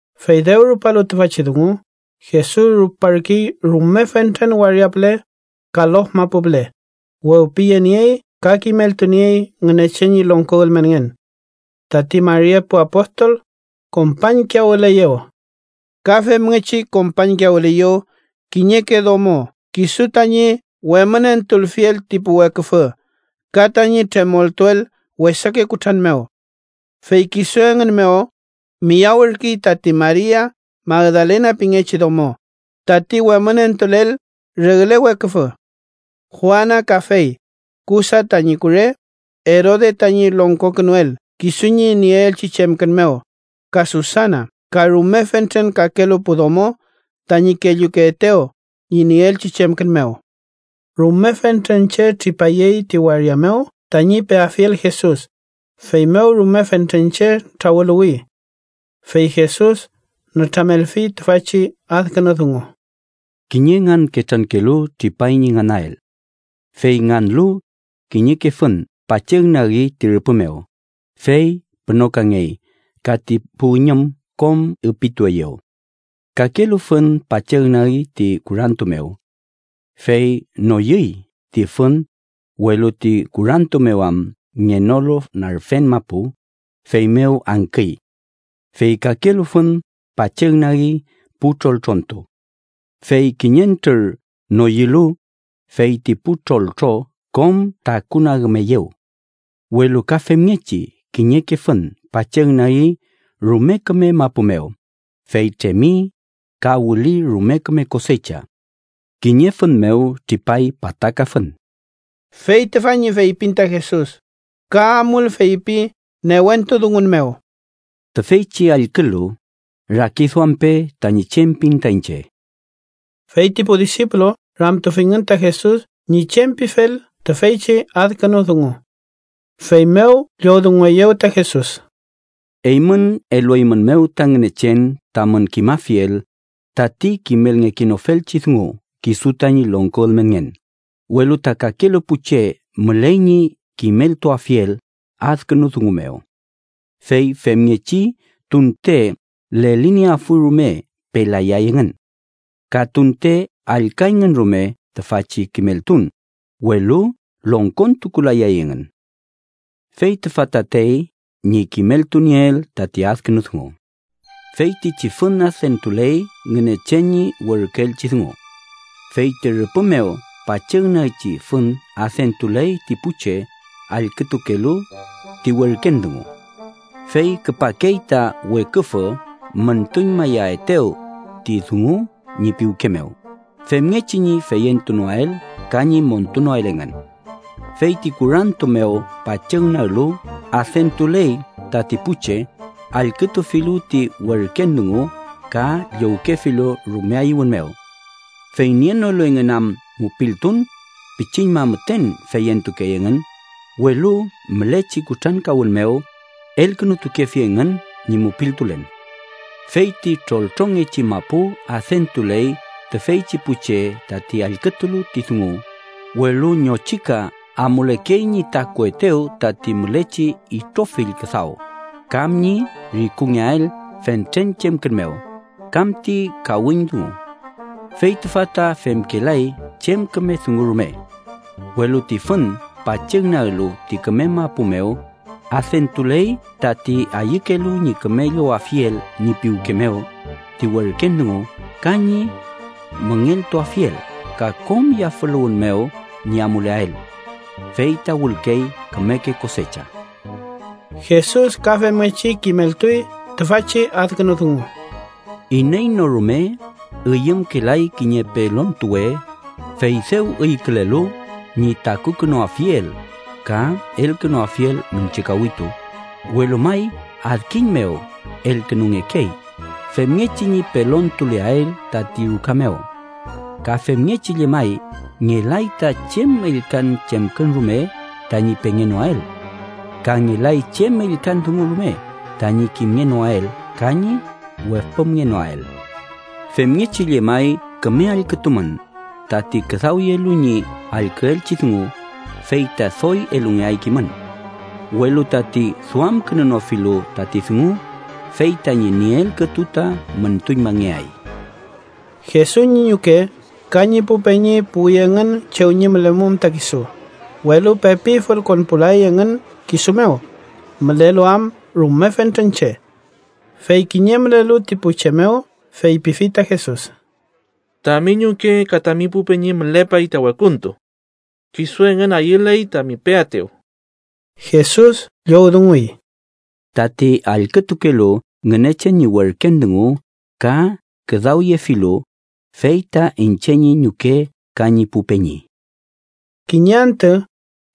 Fey dew rupalu tüfachi dungu, Jesus ruparkey rume fentren waria püle ka lof mapu püle, wewpiyeniey ka kimeltuniey Ngünechen ñi longko ülmenngen. Tati mari epu apostol kompañkiyawüleyew. Ka femngechi kompañkiyawüleyew kiñeke domo kisu tañi wemünentulfiel ti pu weküfü ka tañi tremoltuel wesake kutran mew. Fey kisu engün mew miyawürkey tati Maria Magdalena pingechi domo, tati wemünentulel regle weküfü. Juana kafey, Chusa tañi kure, Erode tañi longkokünuel kisu ñi nieelchi chemkün mew; ka Susana. Ka rume fentren kakelu pu domo tañi kellukeetew ñi nieelchi chemkün mew. Rume fentren che tripayey ti waria mew tañi peafiel Jesus, feymew rume fentren che trawüluwi. Fey Jesus nütramelfi tüfachi adkünu dungu: “Kiñe nganketrankelu tripay ñi nganael. Fey nganlu, kiñeke fün pachügnagi ti rüpü mew, fey pünokangey ka ti pu üñüm kom üpitueyew. Kakelu fün pachügnagi ti kurantu mew. Fey noyüy ti fün, welu ti kurantu mew am ngenolu narfen mapu, feymew angküy. Fey kakelu fün pachügnagi pu troltrontu. Fey kiñentrür noyülu, fey ti pu troltro kom takunagümeyew. Welu ka femngechi kiñeke fün pachügnagi rume küme mapu mew, fey tremi, ka wüli rume küme kosecha. Kiñe fün mew tripay pataka fün.” Fey tüfa ñi feypin ta Jesus, ka amul feypi newentu dungun mew: “¡Tüfeychi allkülu, rakiduampe tañi chem pin ta iñche!” Fey ti pu disipulu ramtufingün ta Jesus ñi chem pifel tüfeychi adkünu dungu. Feymew llowdungueyew ta Jesus: “Eymün elueymünmew ta Ngünechen tamün kimafiel tati kimelngekenofelchi dungu kisu tañi longko ülmenngen, welu ta kakelu pu che müley ñi kimeltuafiel adkünu dungu mew. ‘Fey femngechi tunte lelinieafuy rume, pelayay engün. Ka tunte allküayngün rume tüfachi kimeltun, welu longkontukulayay engün.’ “Fey tüfa tatey ñi kimeltunieel tati adkünu dungu. Feytichi fün adentuley Ngünechen ñi werküelchi dungu. Fey ti rüpü mew pachügnagchi fün adentuley ti pu che allkütukelu ti werken dungu. Fey küpakey ta weküfü müntuñmayaetew ti dungu ñi piwke mew, femngechi ñi feyentunoael ka ñi montunoael engün. Fey ti kurantu mew pachügnaglu adentuley tati pu che allkütufilu ti werken dungu ka llowkefilu rume ayüwün mew. Fey nienolu engün am mupiltun, pichiñma müten feyentukey engün, welu mülechi kutrankawün mew, elkünutukefi engün ñi mupiltulen. Fey ti troltrongechi mapu adentuley tüfeychi pu che tati allkütulu ti dungu, welu ñochika amulekey ñi takuetew tati mülechi itrofill küdaw, kam ñi rikungeael fentren chemkün mew, kam ti kawiñ dungu. Fey tüfa ta femkelay chem küme dungu rume. Welu ti fün pachügnaglu ti küme mapu mew, adentuley tati ayükelu ñi küme llowafiel ñi piwke mew ti werken dungu ka ñi müngeltuafiel ka kom yafüluwün mew ñi amuleael. Fey ta wülkey kümeke kosecha.” Jesus ka femngechi kimeltuy tüfachi adkünu dungu: “Iney no rume üyümkelay kiñe pelontuwe, fey dew üykülelu ñi takukünuafiel, ka elkünuafiel miñche kawitu, welu may adkiñ mew elkünungekey, femngechi ñi pelontuleael tati ruka mew. Ka femngechi llemay ngelay ta chem ellkan chemkün rume tañi pengenoael. Ka ngelay chem ellkan dungu rume tañi kimngenoael ka ñi wepümngenoael. “Femngechi llemay küme allkütumün, tati küdawyelu ñi allküelchi dungu, fey ta doy elungeay kimün. Welu tati duamkünunofilu tati dungu, fey tañi nieel kütu ta müntuñmangeay.” Jesus ñi ñuke ka ñi pu peñi puwi engün chew ñi mülemum ta kisu, welu pepi fülkonpulay engün kisu mew, mülelu am rume fentren che. Fey kiñe mülelu ti pu che mew feypifi ta Jesus: —Tami ñuke ka tami pu peñi mülepay ta wekuntu. Kisu engün ayüley tami peaetew. Jesus llowdunguy: —Tati allkütukelu Ngünechen ñi werken dungu ka küdawyefilu, fey ta iñche ñi ñuke ka ñi pu peñi. Kiñe antü,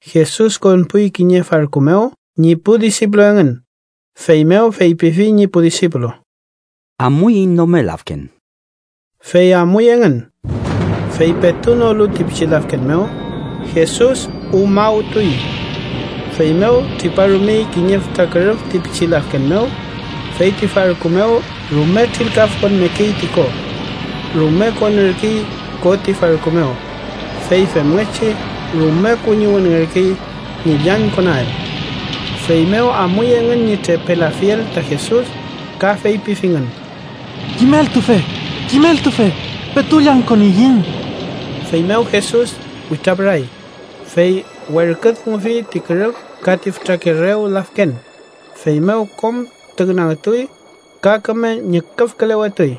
Jesus konpuy kiñe farku mew ñi pu disipulu engün, feymew feypifi ñi pu disipulu: —Amuiñ nome lafken. Fey amuy engün. Fey petu nolu ti pichi lafken mew, Jesus umawtuy. Feymew triparumey kiñe fütra kürüf ti pichi lafken mew, fey ti farku mew rume trilkafkonmekey ti ko. Rume konürkey ko ti farku mew, fey femngechi rume kuñiwünngerkey ñi llañkonael. Feymew amuy engün ñi trepelafiel ta Jesus, ka feypifingün: —¡Kimeltufe! ¡Kimeltufe! ¡Petu llañkoniyiñ! Feymew Jesus witrapüray, fey werküdungufi ti kürüf ka ti fütrake rew lafken, feymew kom tüngnagtuy ka küme ñüküfkülewetuy.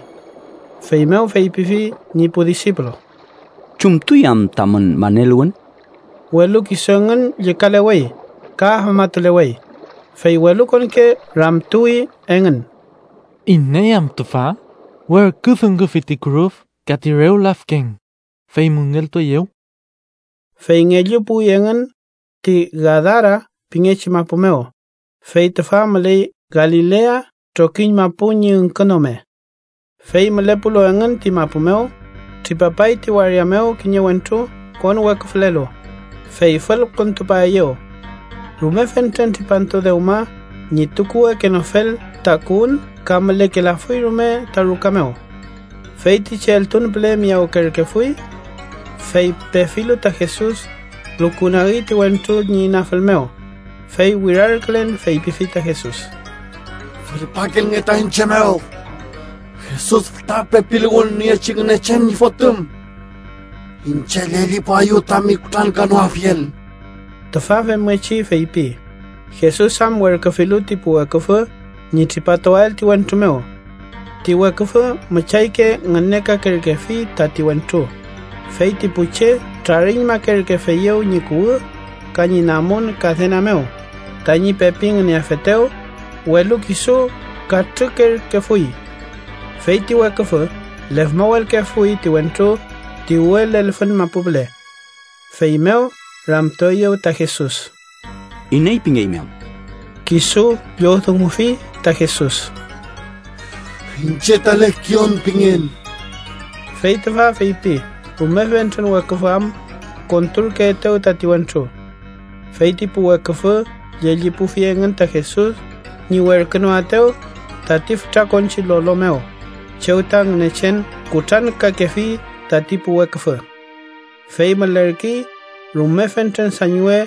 Feymew feypifi ñi pu disipulu: —¿Chumtuy am tamün maneluwün? Welu kisu engün llükalewey ka afmatulewey, fey welukonke ramtuwi engün: “¿Iney am tüfa? Werküdungufi ti kürüf ka ti rew lafken, fey müngeltueyew.” Fey ngellu puwi engün ti Gadara pingechi mapu mew, fey tüfa müley Galilea trokiñ mapu ñi üngkünome. Fey mülepulu engün ti mapu mew, tripapay ti waria mew kiñe wentru konweküfülelu, fey fülkontupaeyew. Rume fentren tripantu dewma ñi tukuwekenofel takuwün ka mülekelafuy rume ta ruka mew. Feytichi eltun püle miyawkerkefuy. Fey pefilu ta Jesus, lukunagi ti wentru ñi inafül mew, fey wirarkülen feypifi ta Jesus: —¡Fülpakilnge ta iñche mew, Jesus fütra pepiluwün niechi Ngünechen ñi Fotüm! ¡Iñche llellipuaeyu tami kutrankanoafiel! Tüfa femngechi feypi, Jesus am werküfilu ti pu weküfü ñi tripatuael ti wentru mew. Ti weküfü müchayke ngünekakerkefi tati wentru, fey ti pu che trariñmakerkefeyew ñi kuwü ka ñi namun kadena mew tañi pepi ngüneafetew, welu kisu katrükerkefuy. Fey ti weküfü lefmawelkefui ti wentru ti uwe lelfün mapu püle. Feymew ramtueyew ta Jesus: —¿Iney pingeymi am? Kisu llowdungufi ta Jesus: —Iñche ta Lekion pingen. Fey tüfa feypi rume fentren weküfü am konturkeetew tati wentru. Fey ti pu weküfü llellipufi engün ta Jesus ñi werkünoaetew tati fütra konchi lolo mew chew ta Ngünechen kutrankakefi tati pu weküfü. Fey mülerkey rume fentren sañwe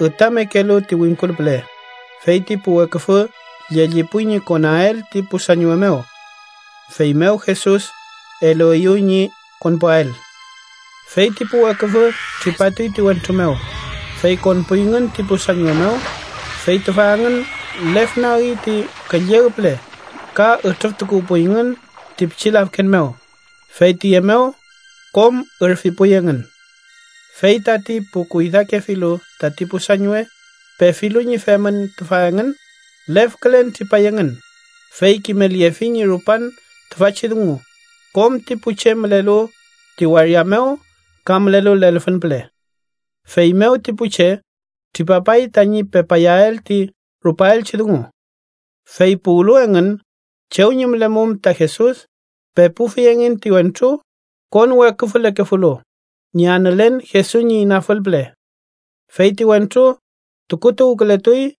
ütamekelu ti wingkul püle, fey ti pu weküfü llellipuy ñi konael ti pu sañwe mew. Feymew Jesus elueyew ñi konpuael. Fey ti pu weküfü tripatuy ti wentru mew, fey konpuyngün ti pu sañwe mew, fey tüfa engün lefnagi ti külleg püle ka ütrüftukuwpuyngün ti pichi lafken mew, fey tüye mew kom ürfipuy engün. Fey tati pu kuydakefilu tati pu sañwe, pefilu ñi femün tüfa engün, lefkülen tripay engün, fey kimelyefi ñi rupan tüfachi dungu kom ti pu che mülelu ti waria mew ka mülelu lelfün püle. Feymew ti pu che tripapay tañi pepayael ti rupaelchi dungu. Fey puwlu engün chew ñi mülemum ta Jesus, pepufi engün ti wentru konweküfülekefulu ñi anülen Jesus ñi inafül püle. Fey ti wentru tukutuwkületuy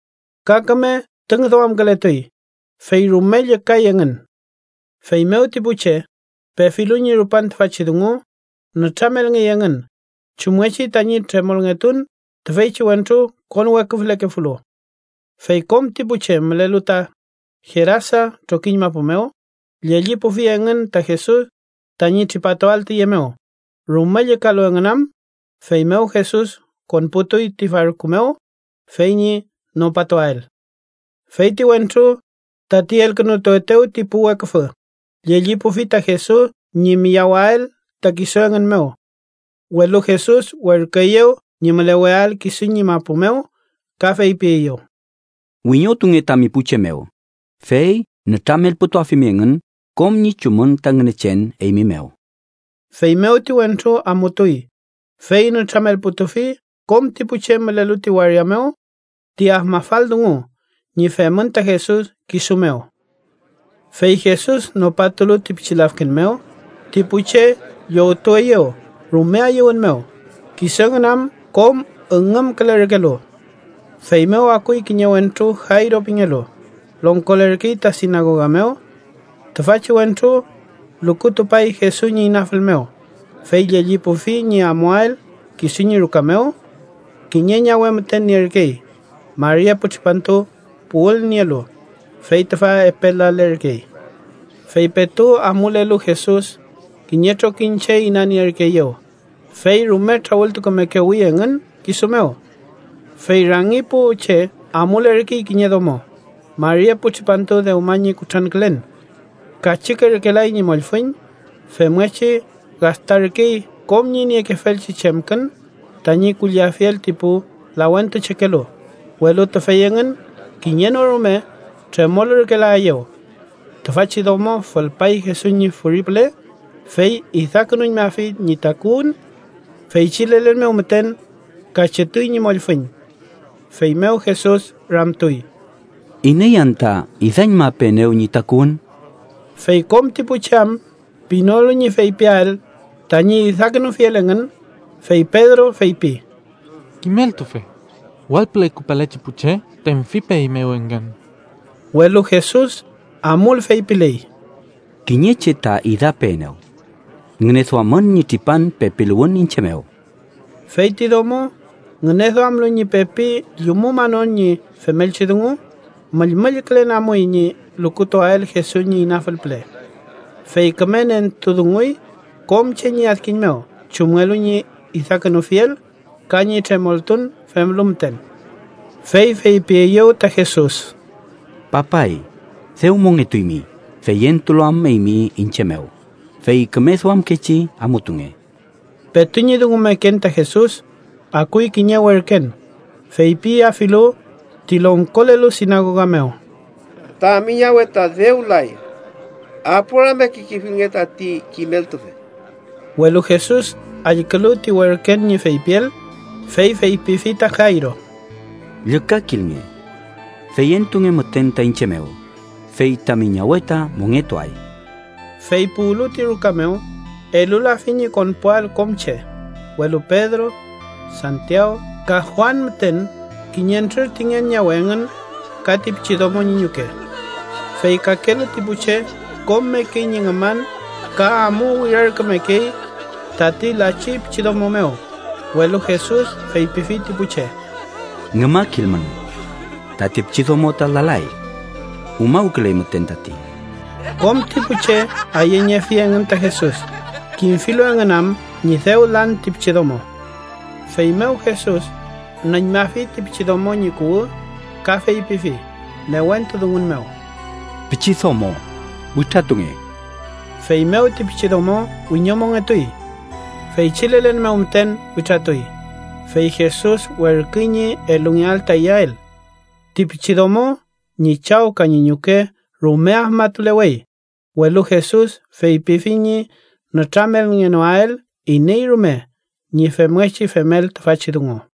ka küme tüngduamkületuy, fey rume llükay engün. Feymew ti pu che, pefilu ñi rupan tüfachi dungu, nütramelngey engün chumngechi tañi tremolngetun tüfeychi wentru konweküfülekefulu. Fey kom ti pu che mülelu ta Gerasa trokiñ mapu mew, llellipufi engün ta Jesus tañi tripatuael tüye mew, rume llükalu engün am. Feymew Jesus konputuy ti farku mew fey ñi nopatuael. Fey ti wentru, tati elkünutuetew ti pu weküfü, llellipufi ta Jesus ñi miyawael ta kisu engün mew. Welu Jesus werküeyew ñi müleweael kisu ñi mapu mew ka feypieyew: —Wiñotunge tami pu che mew, fey nütramelputuafimi engün kom ñi chumün ta Ngünechen eymi mew. Feymew ti wentru amutuy, fey nütramelputufi kom ti pu che mülelu ti waria mew ti afmafal dungu ñi femün ta Jesus kisu mew. Fey Jesus nopatulu ti pichi lafken mew, ti pu che llowtueyew rume ayüwün mew, kisu engün am kom üngümkülerkelu. Feymew akuy kiñe wentru Jayro pingelu, longkolerkey ta sinagoga mew. Tüfachi wentru lukutupay Jesus ñi inafül mew, fey llellipufi ñi amuael kisu ñi ruka mew. Kiñe ñawe müten nierkey, mari epu tripantu puwülnielu, fey tüfa epe lalerkey. Fey petu amulelu Jesus, kiñe trokiñ che inanierkeeyew, fey rume trawültukumekewi engün kisu mew. Fey rangi pu che amulerkey kiñe domo, mari epu tripantu dewma ñi kutrankülen. Kachükerkelay ñi mollfüñ, femngechi gastarkey kom ñi niekefelchi chemkün tañi kulliafiel ti pu lawentuchekelu, welu tüfey engün kiñe no rume tremolürkelaeyew. Tüfachi domo fülpay Jesus ñi furi püle, fey idakünuñmafi ñi takuwün. Feychi lelen mew müten kachütuy ñi mollfüñ. Feymew Jesus ramtuy: —¿Iney anta idañmapeenew ñi takuwün? Fey kom ti pu che am pinolu ñi feypiael tañi idakünufiel engün, fey Pedro feypi: —Kimeltufe, wall püle küpalechi pu che tenfipeeymew engün. Welu Jesus amul feypiley: —Kiñe che ta idapeenew. Ngüneduamün ñi tripan pepiluwün iñche mew. Fey ti domo, ngüneduamlu ñi pepi llumumanon ñi femelchi dungu, müllmüllkülen amuy ñi lukutuael Jesus ñi inafül püle. Fey küme nentudunguy kom che ñi adkiñ mew chumngelu ñi idakünufiel ka ñi tremoltun femlu müten. Fey feypieyew ta Jesus: —Papay, dew mongetuymi feyentulu am eymi iñche mew, fey küme duamkechi amutunge. Petu ñi dungumeken ta Jesus, akuy kiñe werken feypiafilu ti longkolelu sinagoga mew: —Tami ñawe ta dew lay. Aporiamekekefilnge tati kimeltufe. Welu Jesus allkülu ti werken ñi feypiel, fey feypifi ta Jayro: —Llükakilnge. Feyentunge müten ta iñche mew, fey tami ñawe ta mongetuay. Fey puwlu ti ruka mew, elulafi ñi konpuael kom che, welu Pedro, Santiaw ka Juan müten kiñentrür ti ngen ñawe engün ka ti pichidomo ñi ñuke. Fey kakelu ti pu che kom mekey ñi ngüman ka amu wirarkümekey tati lachi pichidomo mew, welu Jesus feypifi ti pu che: —Ngümakilmün. Tati pichidomo ta lalay. Umawküley müten tati. Kom ti pu che ayeñefi engün ta Jesus, kimfilu engün am ñi dew lan ti pichidomo. Feymew Jesus nüñmafi ti pichidomo ñi kuwü ka feypifi newentu dungun mew: —¡Pichidomo! ¡Witratunge! Feymew ti pichidomo wiñomongetuy. Feychi lelen mew müten witratuy, fey Jesus werküy ñi elungeael ta iyael. Ti pichidomo ñi chaw ka ñi ñuke rume afmatulewey, welu Jesus feypifi ñi nütramelngenoael iney rume ñi femngechi femel tüfachi dungu.